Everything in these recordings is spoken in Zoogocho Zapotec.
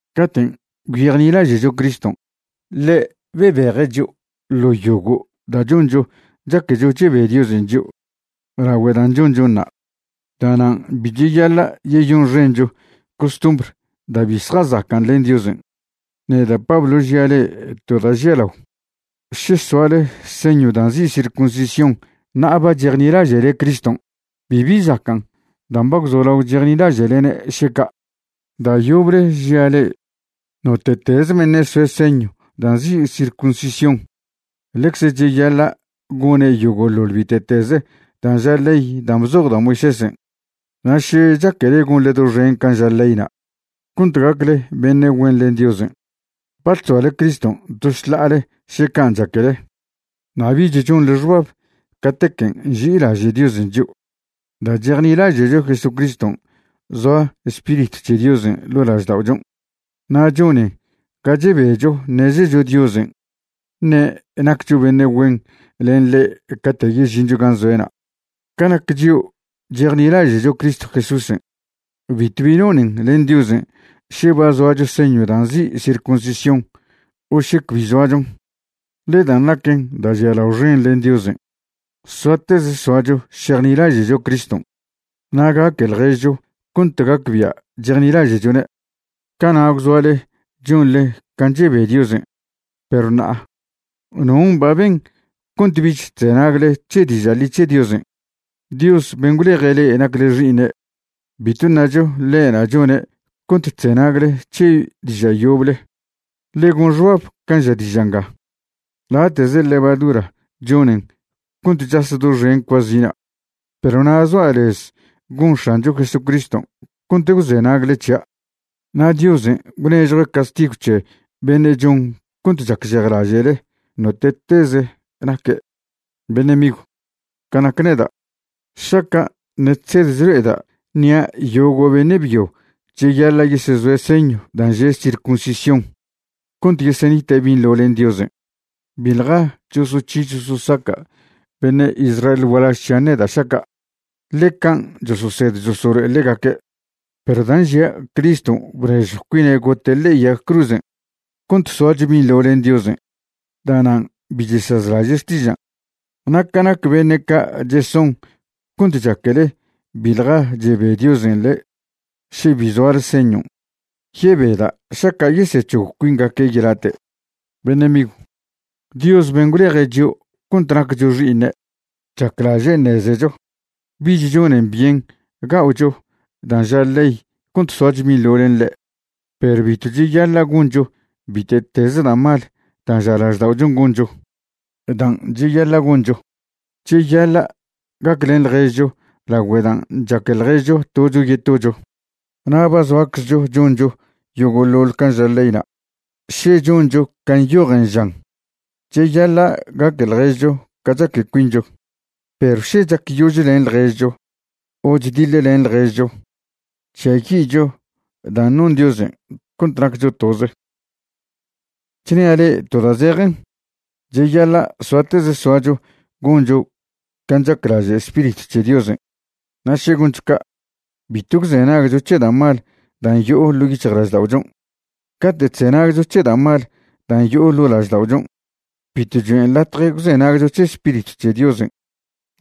Caten' gwyejnilaže'cho Criston', ḻe' bebeje' chio' ḻo yogo' da' choncho chaquecho chebe Diosen' chio' lagüe dan' chonchonṉa'. Da'nan' bi cheyaḻa' yeyonxencho costumbr da' bi zjazacan' len Diosen'. Neda' Pablo žia' le'e to da' žialao. Še soale señw dan' nzi' circuncisión ṉa'a ba chejnilaže'le Criston', bibi zacan' dan' ba gwzolao chejnilaže'lene' še ca'. Da' yoble žia' le'e, note'teze beṉe' soe' señw dan' nzi' circuncisión, ḻecze cheyaḻa' gone' yogo'ḻoḻ bite'teze dan' ža ley dan' bzoj da' Moisésen'. Na' še chaquele gonḻe doxen can' ža leyna' cont gacle beṉe' güen len Diosen', ba chzoale Criston' to šḻa'ale še can' chaquele, na' bich chonḻe xbab catequen' nži'ilaže' Diosen' chio'. Da' chejnilaže'cho Jesucriston' zoa Spiritw c̱he Diosen' ḻo' lažda'ochon', na' chonen ga chebecho ṉezecho Diosen' ṉe' naccho beṉe' güen len ḻe' cate' yežincho gan' zoe'na'. Ca nac chio' chejnilaže'cho Cristo Jesúsen', bitw bi nonen len Diosen' še ba zoacho señw da' nzi' circuncisión o še cbi zoachon. Ḻe dan' naquen da' žialao xen len Diosen', soateze soacho šejnilaže'cho Criston' na' gaque ḻježcho cont gacbia' chejnilaže'chone'. Cana' gwzoale chonḻe can' chebe Diosen', perw ṉa'a ¿non' ba ben cont bich chzenagle c̱he diža' ḻi c̱he Diosen'? Dios ben' gwleje' le'e nacle xi'iṉe', bitw ṉacho ḻe'na' chone' cont chzenagle c̱he diža' yoble. Ḻe gon xbab can' ža diža' nga: “Late'ze levadura chonen cont chas doxen cuazina'.” Perw na' zoa' lez gon X̱ancho Jesucriston' cont gwzenagle c̱hia'. Na' Diosen' gwnežjue' castigw c̱he beṉe' chon cont chacžejlaže'le, note'teze naque'. Beṉe' migw, ca nac neda', šaca' ṉe' chsed chlo'eda' ṉia' yogo' beṉe' byo cheyaḻa' yesezoe' señw dan' že' circuncisión cont yesenite' binḻo len Diosen', biḻja chosoc̱hi chososaca' beṉe' Israel gualaž c̱hian' neda' šaca', ḻe can' chososed chosolo'e ḻegaque'. Perw dan' žia' Criston' bnežjw cuine' gote' ḻe'e yag cruzen' cont soacho binḻo len Diosen', da'nan' bi chesazlaže' xtižan'. Na' ca nac beṉe' ca' cheson cont chaquele biḻja chebe Diosen' le'e še bi zoale señon', yebeda' šaca' yesec̱hog cuingaque' yelate'. Beṉe' migw, Dios ben' gwleje' chio' cont naccho xi'iṉe' chaclaže' ṉezecho bich chonen byen ga'ocho dan' ža ley cont soacho binḻo len ḻe'. Perw bitw cheyaḻa' goncho bite'teze da' mal dan' ža lažda'ochon' goncho. Dan' cheyaḻa' goncho, cheyaḻa' gaclen ḻježcho lagüe dan' chaque ḻježcho tocho yetocho. Na' ba zoaczcho choncho yogo'ḻoḻ can' ža leyna' še choncho can' nyojen žan: “Cheyaḻa' gaque ḻježcho ca chaque cuincho.” Perw še chacyožlen ḻježcho o chdiḻlen ḻježcho, chžiayi'cho dan' non Diosen' cont naccho toze. Chnia' le'e to da' zejen, cheyaḻa' soateze soacho goncho can' chaclaže' Spiritw c̱he Diosen'. Na' še goncho ca', bitw gwzenagcho c̱he da' mal dan' yo'o ḻo' yic̱hjlažda'ochon'. Cate' chzenagcho c̱he da' mal dan' yo'o ḻo' lažda'ochon', bitw choen' latje gwzenagcho c̱he Spiritw c̱he Diosen'.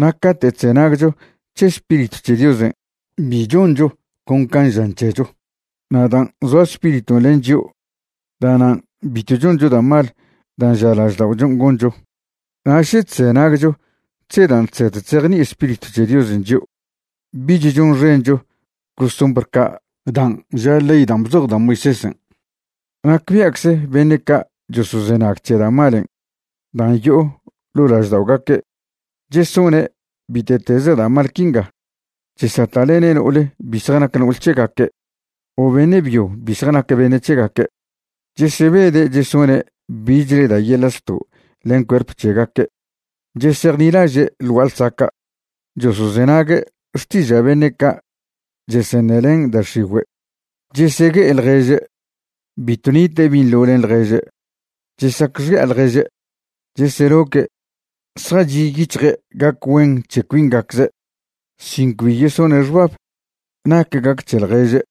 Na' cate' chzenagcho c̱he Spiritw c̱he Diosen', bi choncho con can' žan c̱hecho. Na' dan' zoa Spiriton' len chio', da'nan' bitw choncho da' mal dan' ža lažda'ochon' goncho. Na' še chzenagcho c̱he dan' chsed chzejni'i Spiritw c̱he Diosen' chio', bich chonxencho costumbr ca' dan' ža ley dan' bzoj da' Moisésen'. Nacbia'cze beṉe' ca' chosozenag c̱he da' malen' dan' yo'o ḻo' lažda'ogaque' chesone' bite'teze da' mal quinga: chesata'lene' no'ol bi zjanac no'ol c̱hegaque' o beṉe' byo bi zjanac beṉe' c̱hegaque'; chesebede' chesone' bichle da' yeḻa' zto' len cuerp c̱hegaque'; chesejnilaže' ḻ gua'a ḻsaca'; chosozenague' xtiža' beṉe' ca' cheseṉelen da' x̱igüe'; chesegue'e ḻježe'; bitw nite' binḻo len ḻježe'; chesacxi'a ḻježe'; cheseloque'; zjachi' yic̱hje' gac güen c̱he cuingacze' sin cbi yesone' xbab nac gac c̱he ḻježe';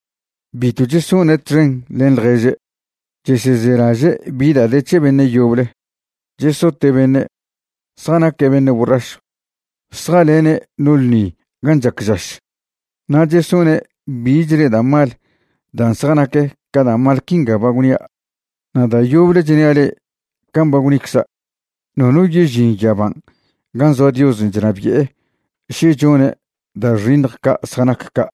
bitw chesone' txen len ḻježe'; chesezelaže' bi da' de c̱he beṉe' yoble; chesote' beṉe'; zjanaque' beṉe' borrašw; zjalene' no ḻṉi gan' chac žaš; na' chesone' bichle da' mal dan' zjanac ca da' mal quinga ba gwnia'. Na' da' yoble chnia' le'e can' ba gwnicza', nono yežin yaban' gan' zoa Diosen' chnabi'e še chone' da' xiṉj ca' zjanac ca'.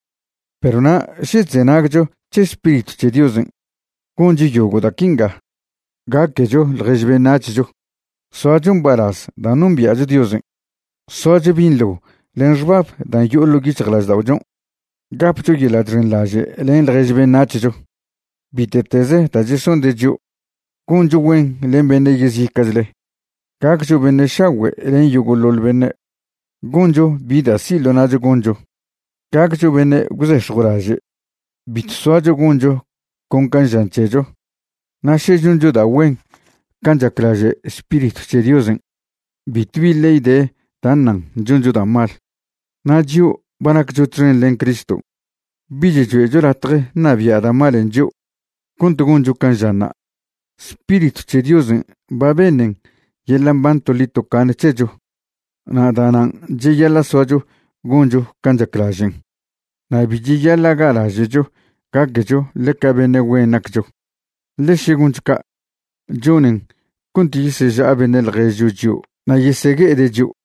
Perw na' še chzenagcho c̱he Spiritw c̱he Diosen', goncho yogo' da' quinga: gaquecho ḻjež beṉac̱hcho; soacho mbalaz dan' nombia'cho Diosen'; soacho binḻo len xbab dan' yo'o ḻo' yic̱hjlažda'ochon'; gapcho yeḻa' chxenḻaže' len ḻjež beṉac̱hcho bite'teze da' chesonde' chio'; goncho güen len beṉe' yezica'chle; gaccho beṉe' šagüe' len yogo'ḻoḻ beṉe'; goncho bi da' si' ḻo na'cho goncho; gaccho beṉe' gwzex̱jwlaže'; bitw soacho goncho con can' žan c̱hecho. Na' še choncho da' güen can' chaclaže' Spiritw c̱he Diosen', bitw bibi ley de da' ṉan choncho da' mal. Na' chio' ba naccho txen len Cristo, bich choe'cho latje ṉabia' da' malen' chio' cont goncho can' žanṉa'. Spiritw c̱he Diosen' ba beṉen yeḻa' mban toḻi tocaṉe c̱hecho, na' da'nan' cheyaḻa' soacho goncho can' chaclažen'. Na' bi cheyaḻa' ga'laže'cho gaquecho ḻeca beṉe' güen naccho, ḻe še goncho ca', chonen cont yeseža'a beṉe' ḻježcho chio' na' yesegue'ede' chio'.